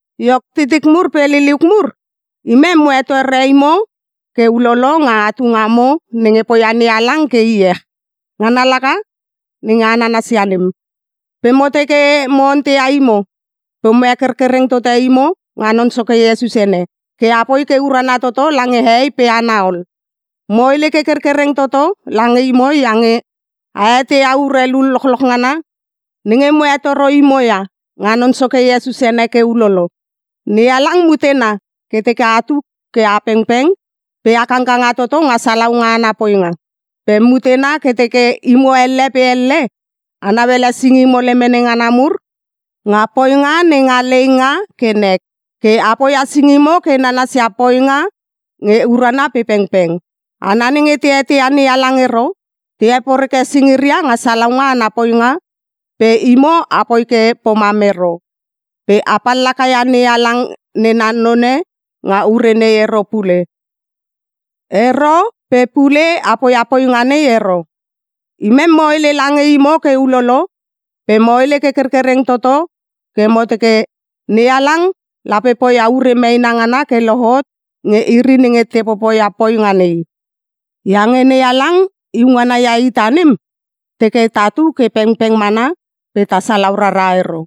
Iok titik mur pe liliuk mur, imem mo hetore imo ke ulolo nga atu ngamo nenge poia NeHalang ke iech, ngana laka nenge a nananasia nem. Pe mo teke mo onteia imo pe mo hekerkereng tote imo nga Non Soke Iesus ene, ke a poi ke urana toto lange hehei pe hana ol. Mo hele ke kerkereng toto lange imo iange a eteia urelu lochloch ngana nenge mo hetoro imo ia, nga Non Soke Iesus ene ke ulolo. NeHalang mutena ke teke atu ke a pengpeng pe a kangkanga toto nga salaunga ana poinga. Pe mutena ke teke imo elle pe elle a nauele singimo lemene ngana mur nga poinga nenga leinga ke nek. Ke a poia singimo ke nanasia poinga nge urana pe pengpeng. Hana nenge te eteia NeHalang ero, te heporeke singiria nga salaunga ana poinga pe imo apoi ke pomam ero. Pe a pallaka ia NeHalang nena none nga ure nei ero pe pule a poia poinga nei ero. Imem mo hele lange imo ke ulolo pe mo hele ke kerkereng toto ke mo teke, NeHalang lape poia ure meena ngana ke lohot nge iri nenge te popoia poinga nei. Iange NeHalang iu ngana ia ita nem, teke tatu ke pengpeng mana pe ta salau rara ero.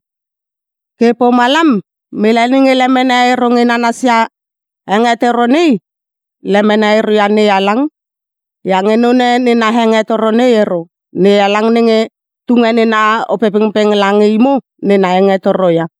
Ke pomalam mele nenge lemene ero nge nanasia hengetoro nei, lemene ero ia NeHalang. Iange none nena hengetoro nei ero, NeHalang nenge tunge nena Opepengpeng lange imo nena hengetoro ia.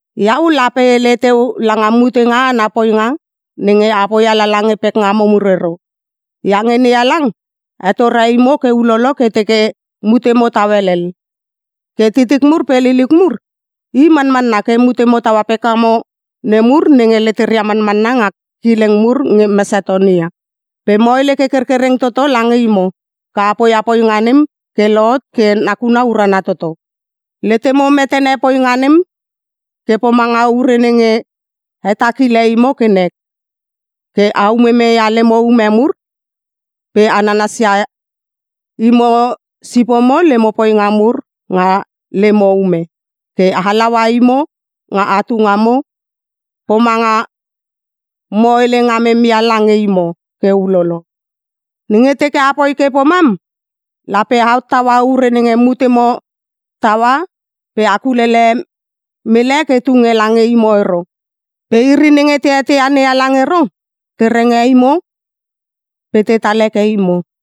Iau lape e hele teu langa mutenga ana poinga nenge a poia lala nge pekngamo mur ero. Iange NeHalang hetore imo ke ulolo ke teke mutemo tau helel. Ke titik mur pe liliuk mur, i manmanna ke mutemo taua pekngamo nemur nenge leteria manmanna nga kileng mur nge Mesatonia, pe mo hele ke kerkereng toto lange imo ke a poia poinga nem ke lohot ke nakuna urana toto. Letemo metene poinga nem ke pomanga ure nenge hetakile imo ke nek, ke a umumeia lemo ume mur pe a nanasia imo sipomo lemo poinga mur nga lemo ume, ke halaua imo nga atu ngamo ke pomanga mo hele ngamem ia lange imo ke ulolo. Nenge teke apoi ke pomam, lape a hottaua ure nenge mutemo taua pe a kulele mele ke tunge lange imo ero. Pe iri nenge te eteia NeHalang ero, te renge imo pe tetal heke imo.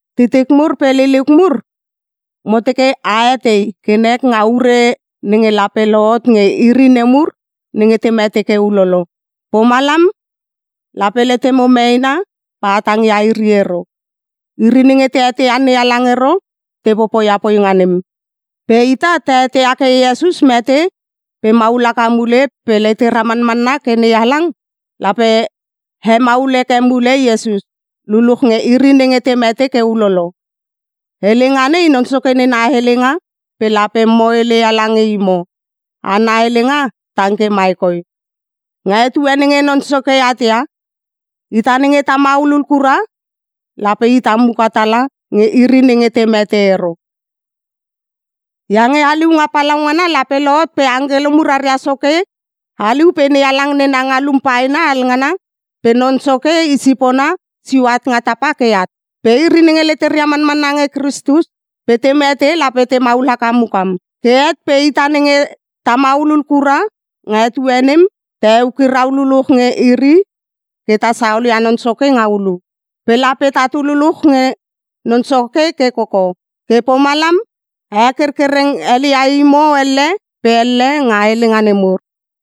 Titik mur pe liliuk mur, mo teke a etei ke nek nga ure nenge lape lohot nge iri nemur nenge te mete ke ulolo, pomalam lape letemo meena pe a tangia iri ero. Iri nenge te eteia NeHalang ero te popoia poinga nem. Pe ita ta eteia ke Iesus mete pe maul haka mule pe letera manmanna ke NeHalang lape hemaul heke mule Iesus, luluch nge iri nenge te mete ke ulolo. Helenga nei Non Soke nena helenga pe lape mo heleia lange imo. Ana helenga tang ke mai koi: Nga etue nenge Non Soke at ia, ita nenge ta maulul kura lape ita muka tala nge iri nenge te mete ero. Iange haliunga palaungana lape lohot pe angkelo mur aria soke haliu pe NeHalang nena ngalum paena alnganngana pe Non Soke i sipona sio nga tapa ke at. Pe iri nenge leteria manmanna nge Kristus pe te mete lape temaul haka mukam. Ke het pe ita nenge ta maulul kura nga etue nem, ta eukirau luluch nge iri ke ta saolia Non Soke nga ulu. Pe lape tatu luluch nge Non Soke ke koko. Ke pomalam a hekerkereng helia imo elle pe elle nga helenga nemur.